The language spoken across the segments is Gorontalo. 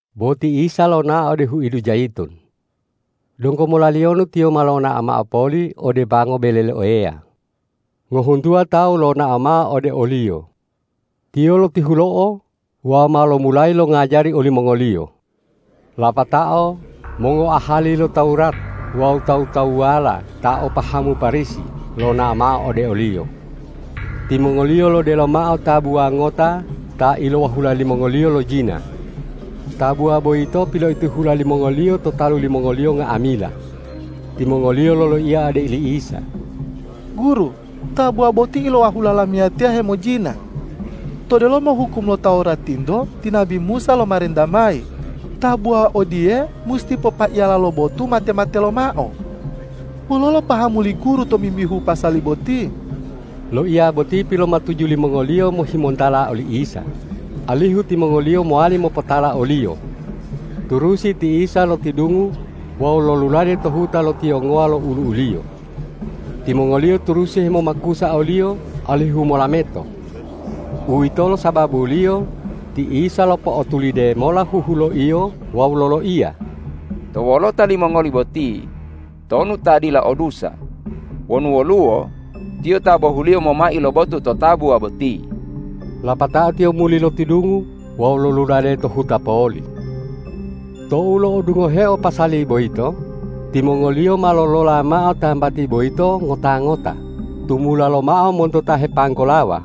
Bo ti Isa lonao ode huidu Jayitun. Donggo molaliyonu Tiyo ma lonao mao poli ode pango bele lo Eya. Ngohuntuwa tawu lonao mao ode o-Liyo. Tiyo lotihulo'o wawu ma lomulayi longajari olimongoliyo. Lapatao mongoahali lo Tawurat wawu tawu-tawuwala ta o pahamu Parisi lonao mao ode o-Liyo. Timongoliyo lodelo mao tabuwa ngota ta ilowahula limongoliyo lojina. Tabuwa boyito piloitihula limongoliyo to talu limongoliyo nga'amila. Timongoliyo loloiya ode li Isa,”Guru, tabuwa boti ilowahula lamiyatiya hemojina. To delomo hukum lo Tawuratinto ti nabi Musa lomarenta mayi, tabuwa odiye musi popaiyala lo botu mate-mate lomao. Wololo pahamu li Guru tomimbihu pasali boti?” Loiya boti pilomatuju limongoliyo mohimontala oli Isa, alihu timongoliyo mowali mopotala o-Liyo. Turusi ti Isa lotidungu wawu lolulade to huta lo tiyongowa lo olu'u-Liyo. Timongoliyo turusi hemomakusa o-Liyo alihu molameto. Uwitolo sababuliyo ti Isa lopo'otulide mola huhuloiyo wawu loloiya,”To wolota limongoli boti tonu ta dila o dusa, wonu woluwo, tiyo ta bohuliyo momai lo botu to tabuwa boti.” Lapatao Tiyo muli lotidungu wawu lolulade to huta poli. Tou lo'odungoheo pasali boyito, timongoliyo ma lolola mao tambati boyito ngota-ngota tumula lomao monto ta hepanggolawa,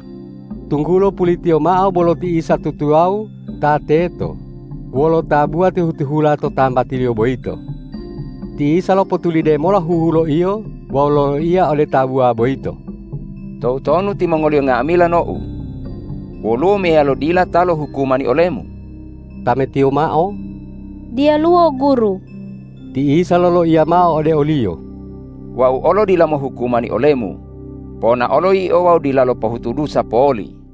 tunggulo pulitiyo mao bolo ti Isa tutuwawu ta teto wolo tabuwa tihu-tihula to tambatiliyo boyito. Ti Isa lopotulide mola huhuloiyo wawu loloiya ode tabuwa boyito,”Toutonu timongoliyo nga'amila nou? Woluwo meyalo dila ta lohukumani olemu?” Tametiyo mao,”Diyaluwo Guru.” Ti Isa loloiya mao ode oliyo,”Wau olo dila mohukumani olemu. Ponaolo yio wawu dilalo pohutu dusa poli.”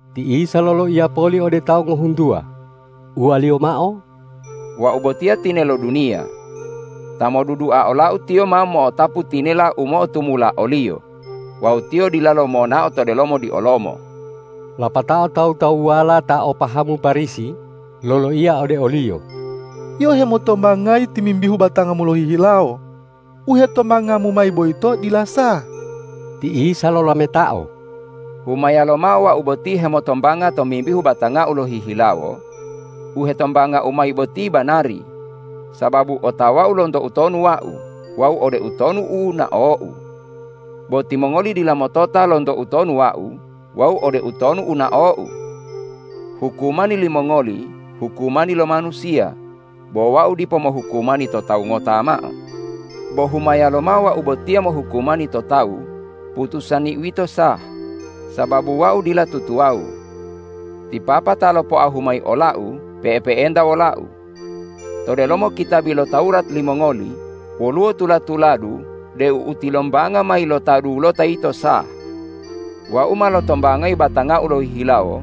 Ti Isa loloiya poli ode tawu ngohuntuwa, uwa-Liyo mao,”Wau botiya tinelo duniya. Ta modudua ola-U tiyo ma mo'otapu tinela u mo'otumula oliyo wawu tiyo dilalo monao to delomo diolomo.” Lapatao tawu-tawuwala ta o pahamu Parisi loloiya ode o-Liyo,”Yio hemotombangayi tomimbihu batangamu lohihilawo. U hetombangamu mayi boyito dila sah.” Ti Isa lolametao,”Humaya lomao Wau boti hemotombanga tomimbihu batanga-U lohihilawo, u hetombanga-U mayi boti banari, sababu otawa-U lonto utonu Wau wawu ode utonu u nao-U. Bo timongoli dila motota lonto utonu Wau wawu ode utonu u nao-U. Hukumani limongoli hukumani lo manusiya, bo Wau dipo mohukumani to tawu ngota mao. Bo humaya lomao Wau botiya mohukumani to tawu, putusani-U yito sah, sababu Wau dila tutuwawu. Ti Papa ta lopoahu mayi ola-U pe'epe'enta wola-U. To delomo kitabi lo Tawurat limongoli woluwo tula-tuladu deu u tilombanga mayi lo ta dulota yito sah. Wau ma lotombangayi batanga-U lohihilawo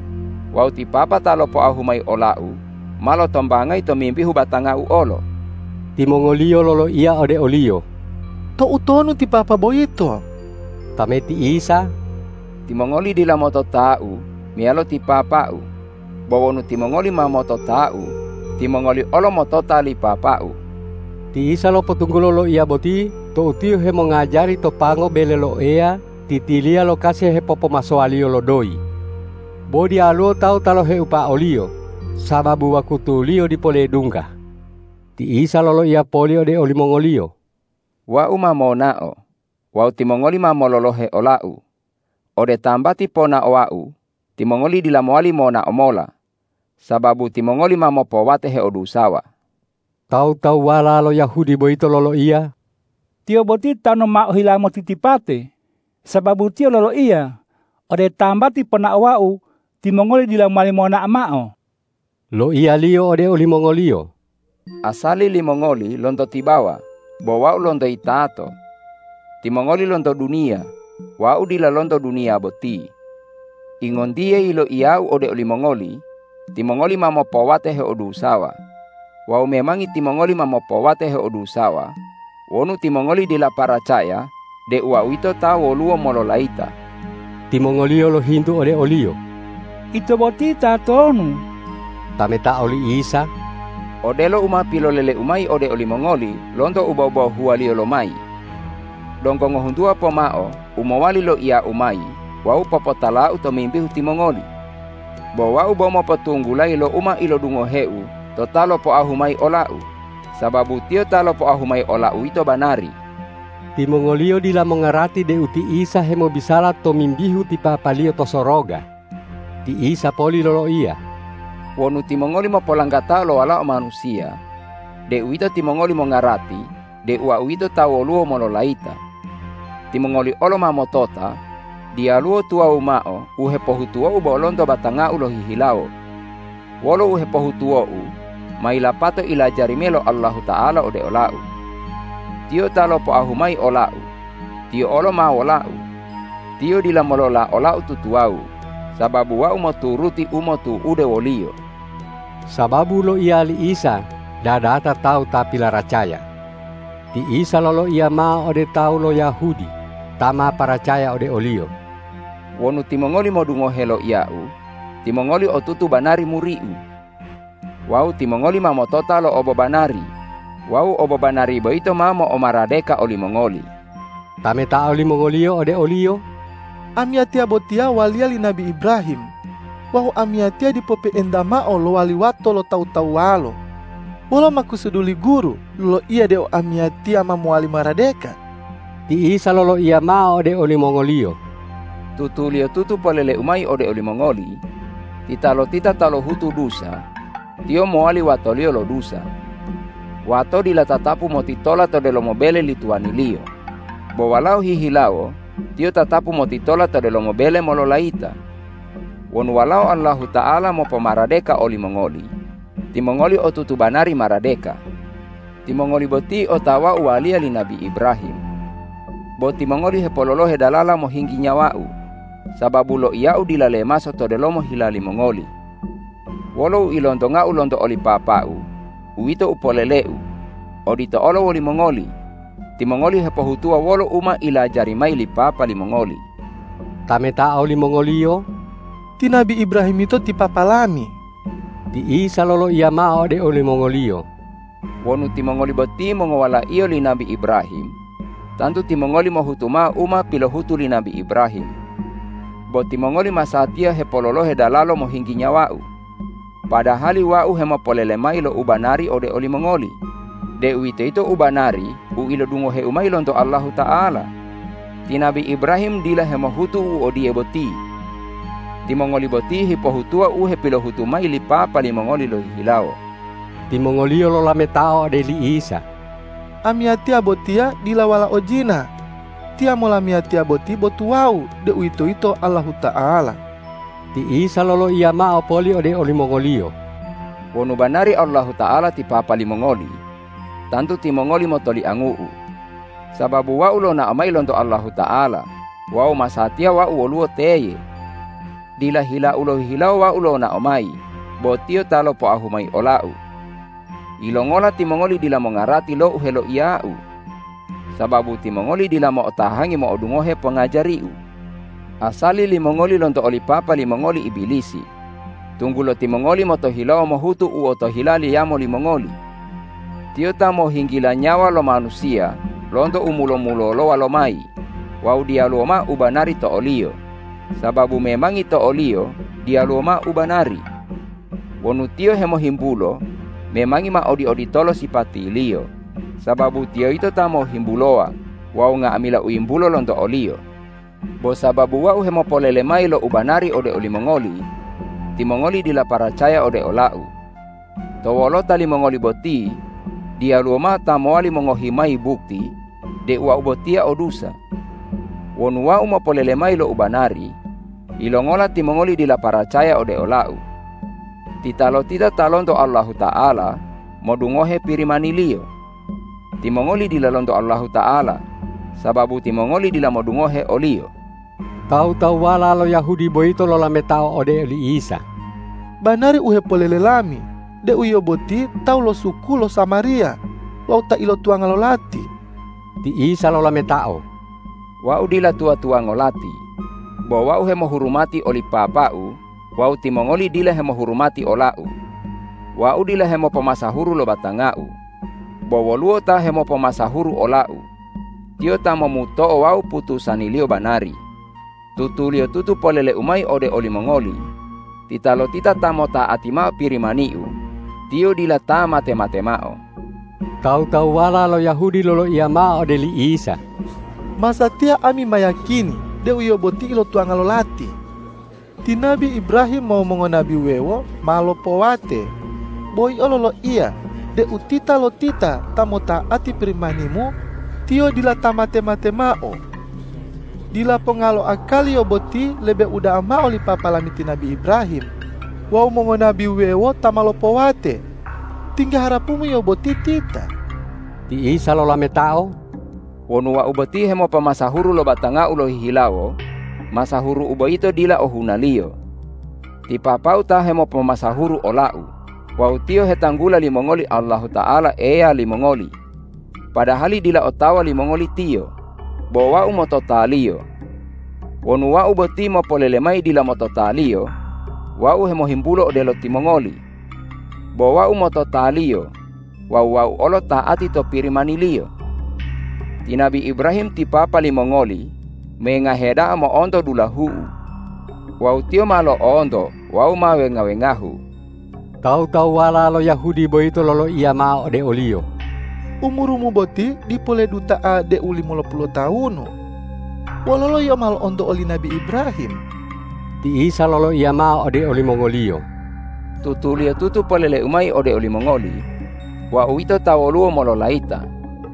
wawu ti Papa ta lopoahu mayi ola-U ma lotombangayi tomimbihu batanga-U olo.” Timongoliyo loloiya ode o-Liyo,”Toutonu ti Papa boyito?” Tameti Isa,”Timongoli dila motota-U meyalo ti Papa-U. Bo wonu timongoli ma motota-U, timongoli olo motota li Papa-U.” Ti Isa lopotunggulo loiya boti tou Tiyo hemongajari to pango bele lo Eya titiliya lo kasi hepopomasowaliyo lo doyi. Bo diyaluwo tawu ta loheupa o-Liyo, sababu wakutuliyo dipo ledungga. Ti Isa loloiya poli ode olimongoliyo,”Wau ma monao wawu timongoli ma mololohe ola-U. Ode tambati ponaowa-U timongoli dila mowali monao mola, sababu timongoli ma mopowate heodusawa.” Tawu-tawuwala lo Yahudi boyito loloiya,”Tiyo boti tanu ma ohila motitipate, sababu Tiyo loloiya, ’Ode tambati ponaowa-U timongoli dila mowali monao mao.’” Loiya-Liyo ode olimongoliyo,”Asali limongoli lonto tibawa, bo Wau lonto yitato. Timongoli lonto duniya; Wau dila lonto duniya boti. Ingontiye yiloiya-U ode olimongoli, timongoli ma mopowate heodusawa. Wawu memangi timongoli ma mopowate heodusawa wonu timongoli dila paracaya deu Wau yito ta woluwo mololayita.” Timongoliyo lohintu ode o-Liyo,”Ito boti tatonu?” Tametao li Isa,”Odelo u ma pilolele-U mayi ode olimongoli lonto u bobohuwaliyo lomayi! Donggo ngohuntuwa pomao u mowali loiya-U mayi wawu popotala-U tomimbihu timongoli, bo Wau bo mopotunggulayi lo u ma ilodungohe-U to Ta lopoahu mayi ola-U, sababu Tiyo ta lopoahu mayi ola-U yito banari.” Timongoliyo dila mongarati deu ti Isa hemobisala tomimbihu ti Papa-Liyo to soroga. Ti Isa poli loloiya,”Wonu timongoli mopolanggatao lo Walao Manusiya, deuwito timongoli mongarati deu Wau yito ta woluwo mololayita. Timongoli olo ma motota, diyaluwo tuwawu mao u hepohutuwo-U bo lonto batanga-U lohihilawo. Wolo u hepohutuwo-U ma yilapato ilajari mayi lo Allahuta'ala ode ola-U. Tiyo ta lopoahu mayi ola-U, Tiyo olo ma wola-U. Tiyo dila molola ola-U tutuwawu, sababu Wau moturuti u motu'ude wo-Liyo.” Sababu loiya li Isa dadata tawu ta pilaracaya. Ti Isa loloiya mao ode tawu lo Yahudi ta ma paracaya ode o-Liyo,”Wonu timongoli modungohe loiya-U, timongoli otutu banari muri-U, wawu timongoli ma motota lo obobanari wawu obobanari boyito ma mo'omaradeka olimongoli.” Tametao limongoliyo ode o-Liyo,”Amiyatiya botiya waliya li nabi Ibrahim. Wawu amiyatiya dipo pe'enta mao lowali wato lo tawu-tawuwalo. Wolo makusudu li Guru loloiya deu amiyatiya ma mowali maradeka?” Ti Isa loloiya mao ode olimongoliyo,”Tutuliyotutu polele-U mayi ode olimongoli: Titalotita ta lohutu dusa, tiyo mowali watoliyo lo dusa. Wato dila tatapu motitola to delomo bele li tuwaniliyo, bo walao hihilawo tiyo tatapu motitola to delomo bele mololayita. Wonu Walao Allahuta'ala mopomaradeka olimongoli, timongoli otutu banari maradeka. Timongoli boti otawau waliya li nabi Ibrahim. Bo timongoli hepololohe dalala mohinggi nyawa-U, sababu loiya-U dila lemaso to delomo hila limongoli. Wolo u ilontonga-U lonto oli Papa-U, uwito u polele-U. Odito olo wolimongoli. Timongoli hepohutuwa wolo u ma ilajari mayi li papa limongoli.” Tametao limongoliyo,”Ti nabi Ibrahim yito ti papa lami.” Ti Isa loloiya mao ode olimongoliyo,”Wonu timongoli boti mongowalaiyo li nabi Ibrahim, tantu timongoli mohutu mao u ma pilohutu li nabi Ibrahim. Bo timongoli masatiya hepololohe dalalo mohinggi nyawa-U, padahali Wau hemopolele mayi lo ubanari ode olimongoli, deuwitoyito ubanari u ilodungohe-U mayi lonto Allahuta'ala. Ti nabi Ibrahim dila hemohutu u odiye boti! Timongoli boti hepohutuwa u hepilohutu mayi li papa limongoli lohihilawo.” Timongoliyo lolametao ode li Isa,”Amiyatiya botiya dila walao jina. Tiyamo lamiyatiya boti bo tuwawu, deuwitoyito Allahuta'ala.” Ti Isa loloiya mao poli ode olimongoliyo,”Wonu banari Allahuta'ala ti papa limongoli, tantu timongoli motoliangu-U, sababu Wau lonao mayi lonto Allahuta'ala wawu masatiya Wau woluwo teye. Dila hila-U lohihilawo Wau lonao mayi, bo Tiyo ta lopoahu mayi ola-U. Yilongola timongoli dila mongarati lo u heloiya-U? Sababu timongoli dila mo'otahangi mo'odungohe pongajari-U. Asali limongoli lonto oli papa limongoli Ibilisi, tunggulo timongoli motohilawo mohutu u otohila liyamo limongoli. Tiyo ta mohinggila nyawa lo manusiya lonto u mulo-mulolowa lomayi wawu diyaluwo mao ubanari to oliyo, sababu memangi to oliyo diyaluwo mao ubanari. Wonu tiyo hemohimbulo, memangi ma odi-oditolo sipatiliyo, sababu tiyo yito ta mohimbulowa wawu nga'amila u yimbulo lonto oliyo. Bo sababu Wau hemopolelemayi lo u banari ode olimongoli, timongoli dila paracaya ode ola-U. To wolota limongoli boti diyaluwo mao ta mowali mongohi mayi bukti deu Wau botiya o dusa. Wonu Wau mopolele mayi lo u banari, yilongola timongoli dila paracaya ode ola-U? Titalotita ta lonto Allahuta'ala, modungohe Pirimani-Liyo. Timongoli dila lonto Allahuta'ala, sababu timongoli dila modungohe o-Liyo.” Tawu-tawuwala lo Yahudi boyito lolametao ode oli Isa,”Banari u hepolele lami deu Yio boti tawu lo suku lo Samariya wawu ta ilotuwanga lo lati!” Ti Isa lolametao,”Wau dila tuwa-tuwango lati. Bo Wau hemohurumati oli Papa-U wawu timongoli dila hemohurumati ola-U. Wau dila hemopomasahuru lo batanga-U. Bo woluwo Ta hemopomasahuru ola-U. Tiyo ta momuto'o wawu putusani-Liyo banari. Tutuliyotutu polele-U mayi ode olimongoli: Titalotita ta mota'ati mao Pirimani-U, tiyo dila ta mate-mate mao.” Tawu-tawuwala lo Yahudi loloiya mao ode li Isa,”Masatiya ami ma yiyakini deu Yio boti ilotuwanga lo lati! Ti nabi Ibrahim wawu mongonabi wuwewo ma lopowate, bo Yio loloiya deu titalotita ta mota'ati Pirimani-Mu, tiyo dila ta mate-mate mao. Dila ponga lo akali Yio boti lebe uda'a mao li papa lami ti nabi Ibrahim wawu mongonabi wuwewo ta ma lopowate! Tingga harapu-Mu Yio boti tita?” Ti Isa lolametao,”Wonu Wau boti hemopomasahuru lo batanga-U lohihilawo, masahuru-U boyito dila ohunaliyo. Ti Papa-U ta hemopomasahuru ola-U wawu Tiyo hetanggula limongoli Allahuta'ala Eya limongoli, padahali dila otawa limongoli Tiyo. Bo Wau motota-Liyo. Wonu Wau boti mopolele mayi dila motota-Liyo, Wau hemohimbulo odelo timongoli. Bo Wau motota-Liyo wawu Wau olo ta'ati to Pirimani-Liyo. Ti nabi Ibrahim ti papa limongoli mengahe da'a mo'onto dulahu-U. Wawu tiyo ma lo'onto wawu ma wenga-wengahu!” Tawu-tawuwala lo Yahudi boyito loloiya mao ode o-Liyo,”Umuru-Mu boti dipo leduta'a deu limolopulu lotawunu. Wololo Yio ma lo'onto oli nabi Ibrahim?” Ti Isa loloiya mao ode olimongoliyo,”Tutuliyotutu polele-U mayi ode olimongoli: Wau yito ta woluwo mololayita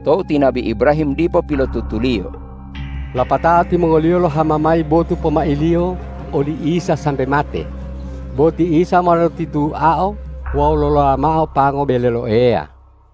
tou ti nabi Ibrahim dipo pilotutuliyo.” Lapatao timongoliyo lohama mayi botu pomailiyo oli Isa sa- mbe mate, bo ti Isa ma lotituao wawu lolola mao pango bele lo Eya.